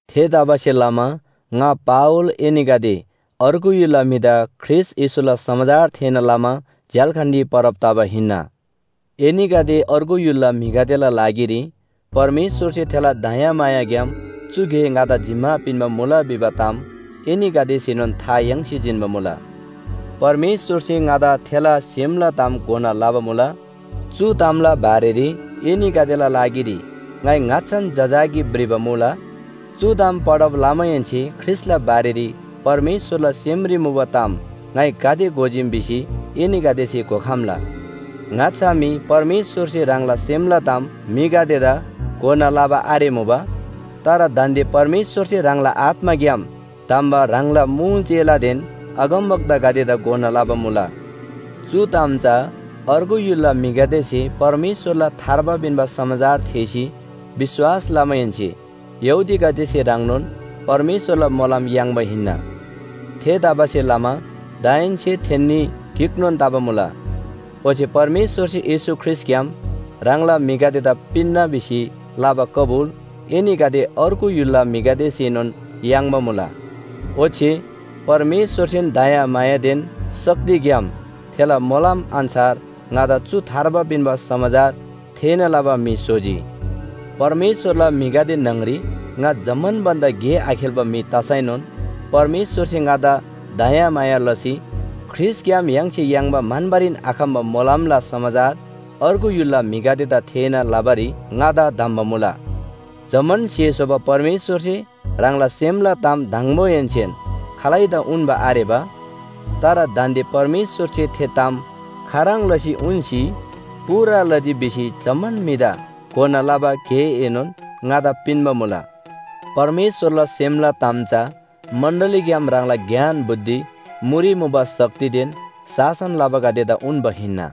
थेतबासेलमा ङा पावल एनीगदे अर्गु य्‍हुलला म्‍हिदा ख्रीष्‍ट येशूला समाचार थेःना लमा झ्‍याल्‍खानरी परब तबा हिन्‍ना। एनीगदे अर्गु य्‍हुलला म्‍हिगदेला लागिरी परमेश्‍वरसे थेला दयामायाग्‍याम चु गे ङादा जिम्‍मा पिन्‍बा मुला भिबा ताम एनीगदेसेनोन था याङ्सी जिन्‍बा मुला। परमेश्‍वरसे ङादा थेला सेमला ताम घोना लबा मुला। चु तामला बारेरी एनीगदेला लागिरी ङाइ ङाच्‍छान जजाकी भ्रिबा मुला। चु ताम पढब लमाहेन्‍से ख्रीष्‍टला बारेरी परमेश्‍वरला सेमरी मुबा ताम ङाइ गाते घोजीम भिसी एनीगदेसे घोखम्‍ला। ङाच्‍छा मी परमेश्‍वरसे ह्राङला सेमला ताम म्‍हिगदेदा घोना लबा आरेमुबा। तर दान्‍दे परमेश्‍वरसे ह्राङला आत्‍माग्‍याम धम्‍बा ह्राङला मुल चेलादेन अगमवक्तागदेदा घोना लबा मुला। चु ताम चा अर्गु य्‍हुलला म्‍हिगदेसे परमेश्‍वरला थार्बा पिन्‍बा समाचार थेःसी विश्‍वास लमाहेन्‍से यहूदीगदेसे ह्रङ्नोन परमेश्‍वरला मोलम याङ्बा हिन्‍ना। थेतबासेलमा दाहेन्‍से थेन्‍नी गिकनोन तबा मुला। ओच्‍छे परमेश्‍वरसे येशू ख्रीष्‍टग्‍याम ह्राङला म्‍हिगदेदा पिन्‍ना भिसी लबा कबुल एनीगदे अर्गु य्‍हुलला म्‍हिसेनोन याङ्बा मुला। ओच्‍छे परमेश्‍वरसेन दयामायादेन शक्तिग्‍याम थेला मोलम अन्‍छार ङादा चु थार्बा पिन्‍बा समाचार थेःना लबा म्‍हि स्‍होजी। परमेश्‍वरला म्‍हिगदे न्‍हङरी ङा जम्‍मान भन्‍दा गे आखेल्‍बा म्‍हि तसैनोन परमेश्‍वरसे ङादा दयामाया लसी ख्रीष्‍टग्‍याम य्‍हाङसे याङ्बा म्‍हन्‍बारीन आखम्‍बा मोलमला समाचार अर्गु य्‍हुलला म्‍हिगदेदा थेःना लबारी ङादा धम्‍बा मुला। जम्‍मान स्‍हे स्‍होबा परमेश्‍वरसे ह्राङला सेमला ताम दङबोहेन्‍सेन खालैदा उन्‍बा आरेबा। तर दान्‍दे परमेश्‍वरसे थे ताम खाह्रङ् लसी उन्‍सी पूरा लजी भिसी जम्‍मान म्‍हिदा घोना लबा गेएनोन ङादा पिन्‍बा मुला। परमेश्‍वरला सेमला ताम चा मण्‍डलीग्‍याम ह्राङला ज्ञान बुद्धि मुरी मुबा शक्तिदेन शासन लबागदेदा उन्‍बा हिन्‍ना।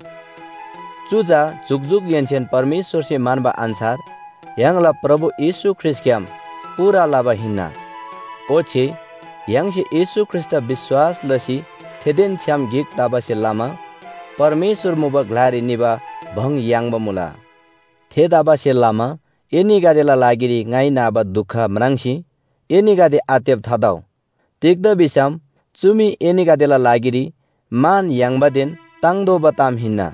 चु चा जुकजुकहेन्‍सेन परमेश्‍वरसे म्‍हन्‍बा अन्‍छार य्‍हाङला प्रभु येशू ख्रीष्‍टग्‍याम पूरा लबा हिन्‍ना। ओच्‍छे य्‍हाङसे येशू ख्रीष्‍टदा विश्‍वास लसी थेदेन छ्‌याम गिक तबासे लमा परमेश्‍वर मुबा ग्‍लारी निबा भङ याङ्बा मुला। थेतबासेलमा एनीगदेला लागिरी ङाइ नाबा दुख म्राङ्सी एनीगदे आत्तेब थातउ। तिग्‍दा भिसम चु मी एनीगदेला लागिरी मान याङ्बादेन ताङ्तोःबा ताम हिन्‍ना।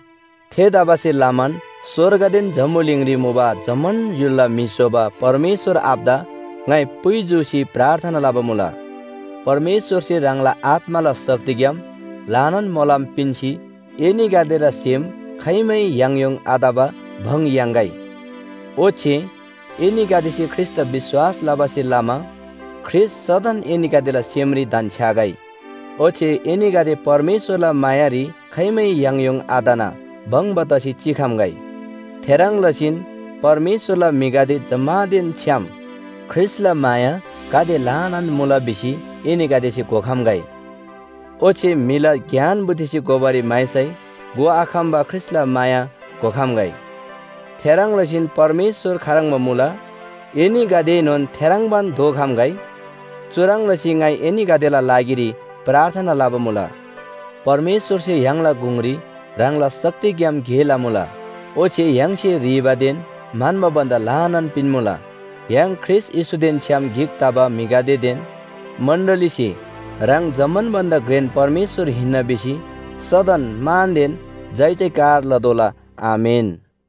थेतबासेलमान स्‍वर्गदेन जम्‍बुलिङरी मुबा जम्‍मान य्‍हुलला म्‍हि स्‍होबा परमेश्‍वर आबादा ङाइ पुइ जूसी प्रार्थना लबा मुला। परमेश्‍वरसे ह्राङला आत्‍माला शक्तिग्‍याम ल्‍हानान मोलम पिन्‍सी एनीगदेला सेम खाइमै याङयोङ आतबा भङ याङ्‌गै। ओच्‍छे एनीगदेसे ख्रीष्‍टदा विश्‍वास लबासे लमा ख्रीष्‍ट सदन एनीगदेला सेमरी धन्‍छ्‌यागै। ओच्‍छे एनीगदे परमेश्‍वरला मायारी खाइमै याङयोङ आतना भङ्‍बा तसी चिखम्‍गै। थेह्रङ् लसीन परमेश्‍वरला म्‍हिगदे जम्‍मानदेन छ्‌याम ख्रीष्‍टला माया गाते ल्‍हानान मुला भिसी एनीगदेसे घोखम्‍गै। ओच्‍छे म्‍हिला ज्ञान बुद्धिसे घोबारी म्‍हाइसै घोआखम्‍बा ख्रीष्‍टला माया घोखम्‍गै। थेह्रङ् लसीन परमेश्‍वर खाह्रङ्बा मुला, एनीगदेएनोन थेह्रङ्बान दोखम्‍गै। चुह्रङ् लसी ङाइ एनीगदेला लागिरी प्रार्थना लबा मुला। परमेश्‍वरसे य्‍हाङला गुङरी ह्राङला शक्तिग्‍याम गे लमुला। ओच्‍छे य्‍हाङसे ह्रीबादेन म्‍हन्‍बा भन्‍दा ल्‍हानान पिन्‍मुला। य्‍हाङ ख्रीष्‍ट येशूदेन छ्‌याम गिक तबा म्‍हिगदेदेन मण्‍डलीसे ह्राङ जम्‍मान भन्‍दा घ्रेन परमेश्‍वर हिन्‍ना भिसी सदन मानदेन जयजयकार लतोःला। आमेन।